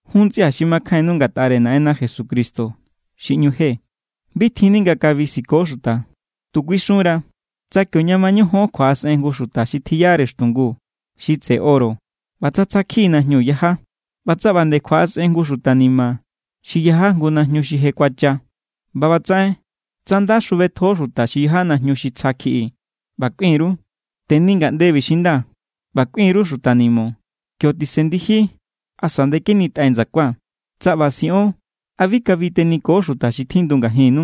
Jun ntsꞌia̱ xi makjainnu ngatꞌare Naꞌenna Jesucristo xi ꞌñu je, bi tjinni nga kabi siko xuta. Tu kuixunra, tsa kio ña mañojon kjuaꞌasꞌen jngu xuta xi tjiyare xtungu xi tseꞌe oro ꞌba tsa tsja= kjiꞌi najñu yaja, ꞌba tsa ꞌba nde kjuaꞌasꞌen jngu xuta ni̱ma̱ xi yaja jngu najñu xi je kuacha, ꞌba ꞌbatsaꞌen tsa nda xjubetjo xuta xi yaja najñu xi tsja kjiꞌi ꞌba kꞌuin_ru: “Teni ngaꞌndebi xi nda”, ꞌba kꞌuin_ru xuta ni̱mo̱: “Kio tisen ndiji asa ndekenitꞌai ndsakua.” Tsa ꞌba siꞌon, ¿a bi kabi teniko xuta xi tjindu ngajinnu?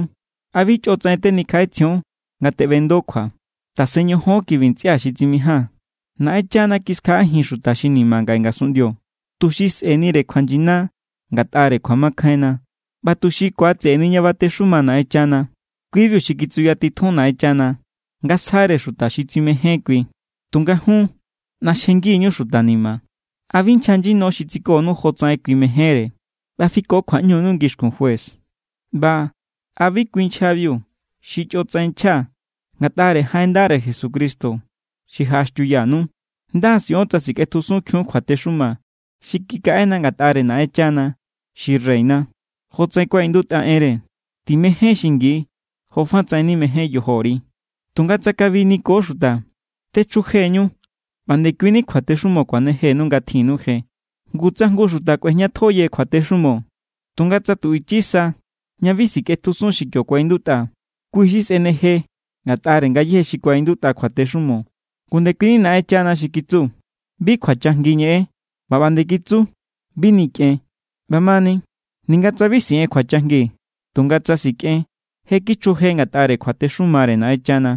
¿A bi chꞌotsaꞌen tenikjaꞌetsjion nga teꞌbendo kjua? Tasen ñojon kibi ntsꞌia̱ xi tsimijaa̱n. Naꞌenchana kiskjaꞌajin xuta xi ni̱ma̱ ngaꞌe ngasunꞌndio, tuxi sꞌe̱nire kjuanyina ngatꞌare kjuamakjainna ꞌba tuxi ku̱atse̱ꞌe̱ni ña batexuma Naꞌenchana. Kui=biu xi kitsuyatitjun Naꞌenchana nga sjare xuta xi tsimején kui. Tunga jun, ꞌnaxjengi=ñu xuta ni̱ma̱. ¿A bi nchja nyino xi tsikonu jotsaꞌen kui mejénre ꞌba fiko kjuaꞌñunu ngixkun juez? ꞌBa ¿a bi kui nchjabiu xi chꞌotsaꞌen nchja ngatꞌare jaꞌen ndare Jesucristo xi jaꞌaxtiuyanu? Nda= siꞌon tsa sikꞌetjusunkjiun kjuatexuma xi kikaꞌena ngatꞌare Naꞌenchana xi reyna, jotsaꞌen kuaꞌindutꞌa enre: “Timején xingi jofatsaꞌen nimején yojori.” Tunga tsa kabi niko xuta, techjujeñu ꞌba ndekuini kjuatexumo kuanejenu nga tjinnu je. Ngu tsa jngu xuta kꞌuejñatjo yeje kjuatexumo, tunga tsa tu ichi sa ña bi sikꞌetjusun xi kio kuaꞌindutꞌa, kui xi sꞌeneje ngatꞌare ngayéje xi kuaꞌindutꞌa kjuatexumo. Ngu ndekui Naꞌenchana xi kitsu: “Bi kjuachajngi ñeꞌen”, ꞌba ꞌba nde kitsu: “Bi nikꞌen.” ꞌBamani, ninga tsa bi siꞌen kjuachajngi, tunga tsa sikꞌen, je kichjuje ngatꞌare kjuatexumare Naꞌenchana.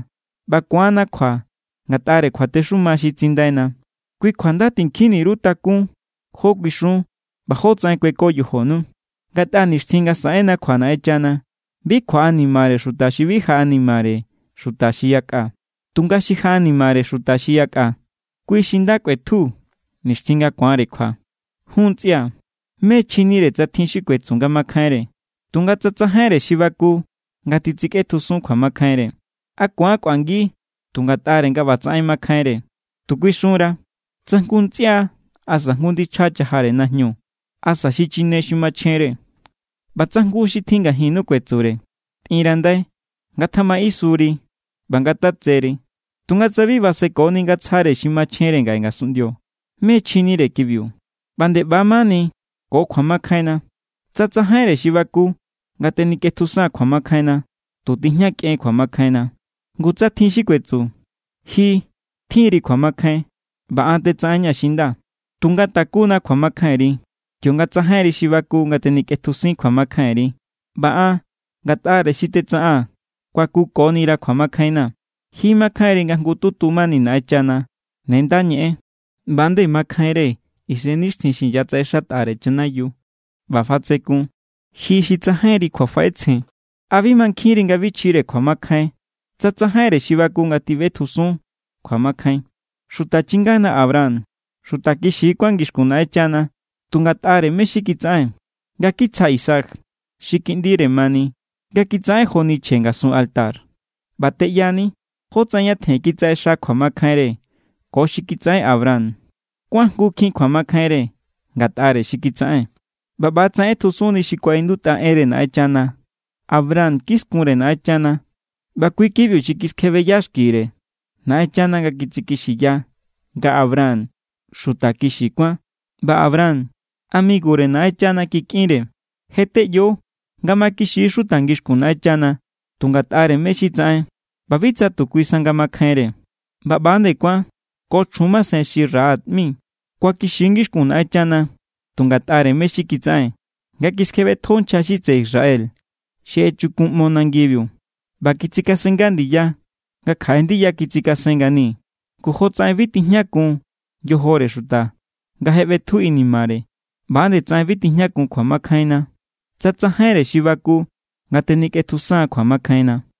ꞌBa ku̱anna kjua ngatꞌare kjuatexuma xi tsindaina, kui kjua nda tinkjinni_ru takún jó kuixun ꞌba jótsaꞌen kueko yojonu. Ngatꞌa nixtjin nga saꞌenna kjua Naꞌenchana, bi kjuaꞌanimare xuta xi bi jaꞌanimare xuta xi yakꞌa. Tunga xi jaꞌanimare xuta xi yakꞌa, kui xi nda kꞌuetju nixtjin nga ku̱anre kjua. Jun ntsꞌia̱, ¿mé= chjinire tsa tjin xi kuetsu nga makjainre, tunga tsa tsajainre xi baku nga titsikꞌetjusun kjuamakjainre? ¿A ku̱an kꞌuangi tu ngatꞌare nga ꞌbatsaꞌen makjainre? Tu kuixunra tsa jngu ntsꞌia asa jngu ndichja chajare najñu asa xichine xi machjenre, ꞌba tsa jngu xi tjin ngajinnu kuetsure: “Tꞌirandai, ngatjamaꞌisuri ꞌba ngatatseri”, tunga tsa bi basekoni nga tsjare xi machjenre ngaꞌe ngasunꞌndio, ¿mé= chjinire kibiu? ꞌBa nde ꞌba= mani ko kjuamakjainna. Tsa tsajainre xi baku nga tenikꞌetjusan kjuamakjainna, tu tijña kꞌen kjuamakjainna. Ngu tsa tjin xi kuetsu: “Ji tjin=ri kjuamakjain, ꞌba an tetsaꞌenña̱ xi nda.” Tunga takunna kjuamakjainri kionga tsajainre xi baku nga tenikꞌetjusin kjuamakjainri, ꞌba an ngatꞌare xi tetsaꞌaa̱n kuakukonira̱ kjuamakjainna̱. Ji mankjainri nga jngututu mani Naꞌenchana. Ne nda ñeꞌen. ꞌBa=nde makjainre isennixtjin xi inyatsaꞌexatꞌare chanayiu ꞌba fatsekun. Ji xi tsajainri kjuafaꞌetsjen, ¿a bi mankjinri nga bi chjire kjuamakjain tsa tsajainre xi baku nga tjiꞌbetjusun kjuamakjain? Xuta chingana Abraham xuta kixi= kuán ngixkun Naꞌenchana tu ngatꞌare mé= xi kitsaꞌen, nga kitsja Isaac xi kiꞌndire mani nga kitsaꞌen joni chje ngasun altar. ꞌBa teꞌyani jótsaꞌen ñatjen kitsaꞌexa kjuamakjainre ko xi kitsaꞌen Abraham. Kuajngukjin kjuamakjainre ngatꞌare xi kitsaꞌen. ꞌBa ꞌbatsaꞌen ꞌetjusunni xi kuaꞌindutꞌa enre Naꞌenchana: “Abraham kiskunre Naꞌenchana, ꞌba kui= kibiu xi kiskjebeya xkire Naꞌenchana nga kitsikixiya nga Abraham xuta kixi kuán.” ꞌBa Abraham amigure Naꞌenchana kikꞌinre. Je teꞌyo nga makixi= xuta ngixkun Naꞌenchana tu ngatꞌare mé= xi tsaꞌen ꞌba bi tsa tu kui sa nga makjainre. ꞌBa ꞌba=nde kuán ko chjun masen xi Rahab ꞌmi. Kuakixi= ngixkun Naꞌenchana tu ngatꞌare mé= xi kitsaꞌen, nga kiskjebetjo nchja xi tseꞌe Israel xi echukunꞌmo nangibiu ꞌba kitsikasennga ndiya nga kjaꞌe ndiya kitsikasen ngani. Ngu jotsaꞌen bi tijñakun yojore xuta nga je ꞌbetju inimare, ꞌba=nde tsaꞌen bi tijñakun kjuamakjainna tsa tsajainre xi baku nga tenikꞌetjusan kjuamakjainna.